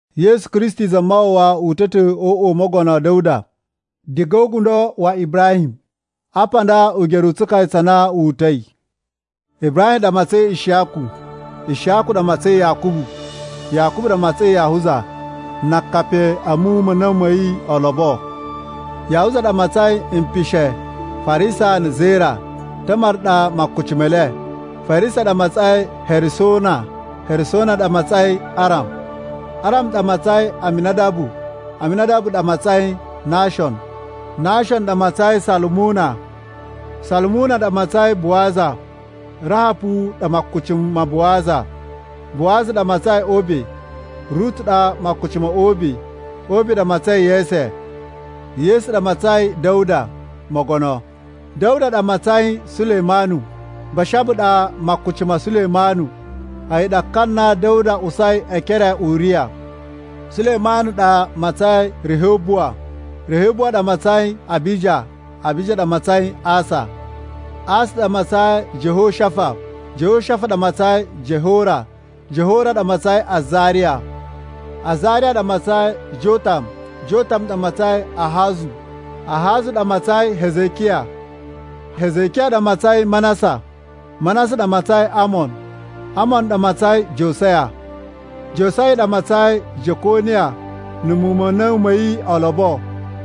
Yesu Kristi Zamawawa uta̱ ta̱ o uꞌwa u Mogono Da̱wuda diga o ugundo wa Ibrahim. Apa nda ugeru u tsukaya tsa na wu uta̱i. Ibrahim ɗa matsain Ishiyaku. Ishiyaku ɗa matsain Yakubu. Yakubu ɗa matsain Yahuza na akapi a̱ muwun ma̱ a̱na̱wu ma̱ yi olobo. Yahuza ɗa matsain mpishe Farisa na̱ Zera (Tamar ɗa makuci me le). Farisa ɗa matsain Hesuruna. Hesuruna ɗa matsain Aram. Aram ɗa matsain Aminadabu. Aminadabu ɗa matsain Nashon. Nashon ɗa matsain Salumuna. Salumuna ɗa matsain Buwaza. (Rahapu ɗa makuci ma Buwaza.) Buwaza ɗa matsain Obe. (Rutu ɗa makuci ma̱ Obe.) Obe ɗa matsain Yese. Yese ɗa matsain Da̱wuda Mogono. Da̱wuda ɗa matsain Sulemanu. (Bashaba ɗa makuci ma̱ Sulemanu, a̱yi ɗa ka na Da̱wuda usai e ekere a Uriya.) Sulemanu ɗa matsain Rihobuwa. Rihobuwa ɗa matsain Abija. Abija ɗa matsain Asa. Asa ɗa matsain Jehoshafa. Jehoshafa ɗa matsain Jehora. Jehora ɗa matsain Azariya. Azariya ɗa matsain Jotam. Jotam ɗa matsain Ahazu. Ahazu ɗa matsain Hezekiya. Hezekiya ɗa matsain Manasa. Manasa ɗa matsain Amon. Amon ɗa matsain Josaya. Josaya ɗa matsain Jekoniya na̱ muwun ma̱ a̱na̱wu ma̱ yi olobo.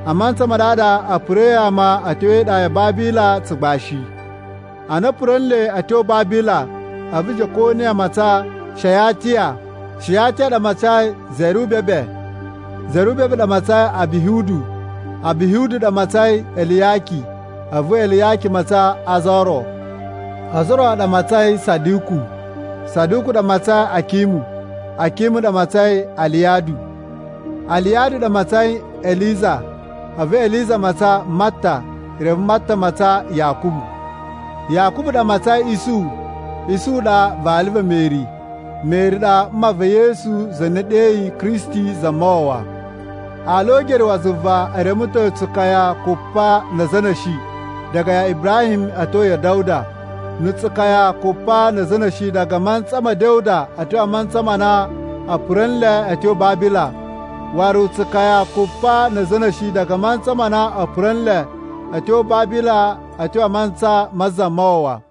(A mantsa ma ɗaɗa a̱ pura̱i ama a̱ tyo e iɗa ya Babila tsugbashi.) Ana a̱ pura̱ nle a̱ tyo Babila, a̱vu Jekoniya matsan Shayatiya. Shayatiya ɗa matsain Zerubabe. Zerubabe ɗa matsain Abihudu. Abihudu ɗa matsain Eliyaki. A̱vu Eliyaki matsan Azoro. Azoro ɗa matsain Saduku. Saduku ɗa matsain Akimu. Akimu ɗa matsain Aliyadu. Aliyadu ɗa matsain Eliza. A̱vu Eliza matsan Mata. Reve Mata matsan Yakubu. Yakubu ɗa matsain Isuhu. Isuhu ɗa vali va̱ Meri, Meri ɗa mma va̱ Yesu za na e ɗeyi Kristi Zamawawa. Ala o ugeru wa zuva e reme ta̱ tsukaya kupa na̱ a̱za̱ a̱ na̱shi diga ya Ibrahim a̱ tyo ya̱ Da̱wuda, na̱ tsukaya kupa na̱ a̱za̱ a̱ na̱shi diga a mantsa ma̱ Da̱wuda a̱ tyo mantsa ma na a̱ pura̱ nle a̱ tyo Babila, waru na̱ tsukaya kupa na̱ a̱za̱ a̱ na̱shi diga a mantsa ma na a̱ pura̱ nle a̱ tyo Babila a̱ tyo mantsa ma Zamawawa.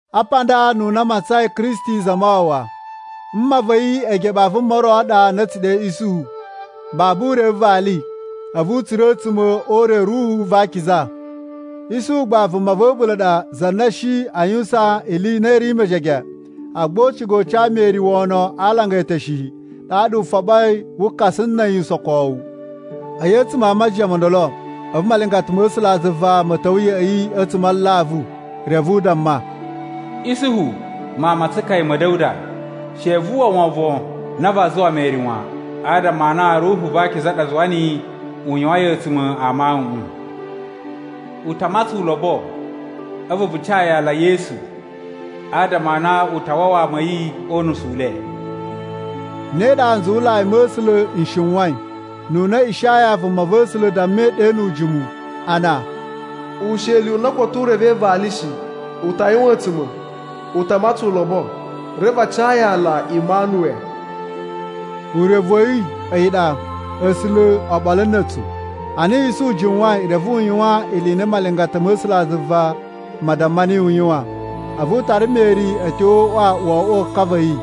Apa nda ununa a matsain Kristi Zamawawa. Mma va̱ yi eegeɓe a vuma ro ɗa na a̱ tsu ɗe Isuhu. Babu u reve vali, a̱vu u tsura̱ a̱a̱tsuma̱ o ure wa̱ Ruhu va Akiza. Isuhu gba vuma va̱ a̱ɓula̱ ɗa za na shi a yuwusan ili i na i ri mejege; agba u ciga u ca Meri wono a alanga e eteshe shi, ɗaɗa u foɓoi wu kasa na̱ a̱yi usokowu. A̱yi a̱tsuma̱ a majiyan mo ndolo, a̱vu malingata ma̱ A̱sulazuva ma̱ ta̱wa̱ ya̱ꞌa̱ yi a̱tsuma̱ a alavu, reve u damma, “Isuhu, mawun ma tsukaya ma̱ Da̱wuda, she vu uwwa wovon na vaa zuwa Meri wan, adama a na Ruhu va Akiza ɗa zuwa niyi u yuwain a̱a̱tsuma̱ a mawuꞌun. U ta matsan ulobo, a̱vu vu ca yi aala Yesu, adama a na u ta wawa ama a̱ yi o unusu u le.” Ne ɗa nzuwulai ma̱ A̱sulazuva n shiwain, ununa Ishaya vumava̱sula̱ dammai ɗe nu ujimu, a na, “Usheli u na koto u revei vali shi u ta yuwan a̱a̱tsuma̱, u ta matsan ulobo, reve a ca yi aala Imanuwe.” Urevu wa̱ yi a̱yi ɗa, “A̱sula̱ oɓolo na̱ a̱tsu.” Ana Isuhu jiwain, reve u yuwan ili i na malingata ma̱ A̱sulazuva ma damma niyi u yuwan. A̱vu u tara Meri a̱ tyo o uꞌwa wo oꞌwo ka va̱ yi,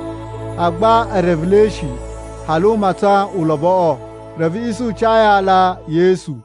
agba e revelei shi hali u matsan uloboꞌo. Reve Isuhu ca yi aala Yesu.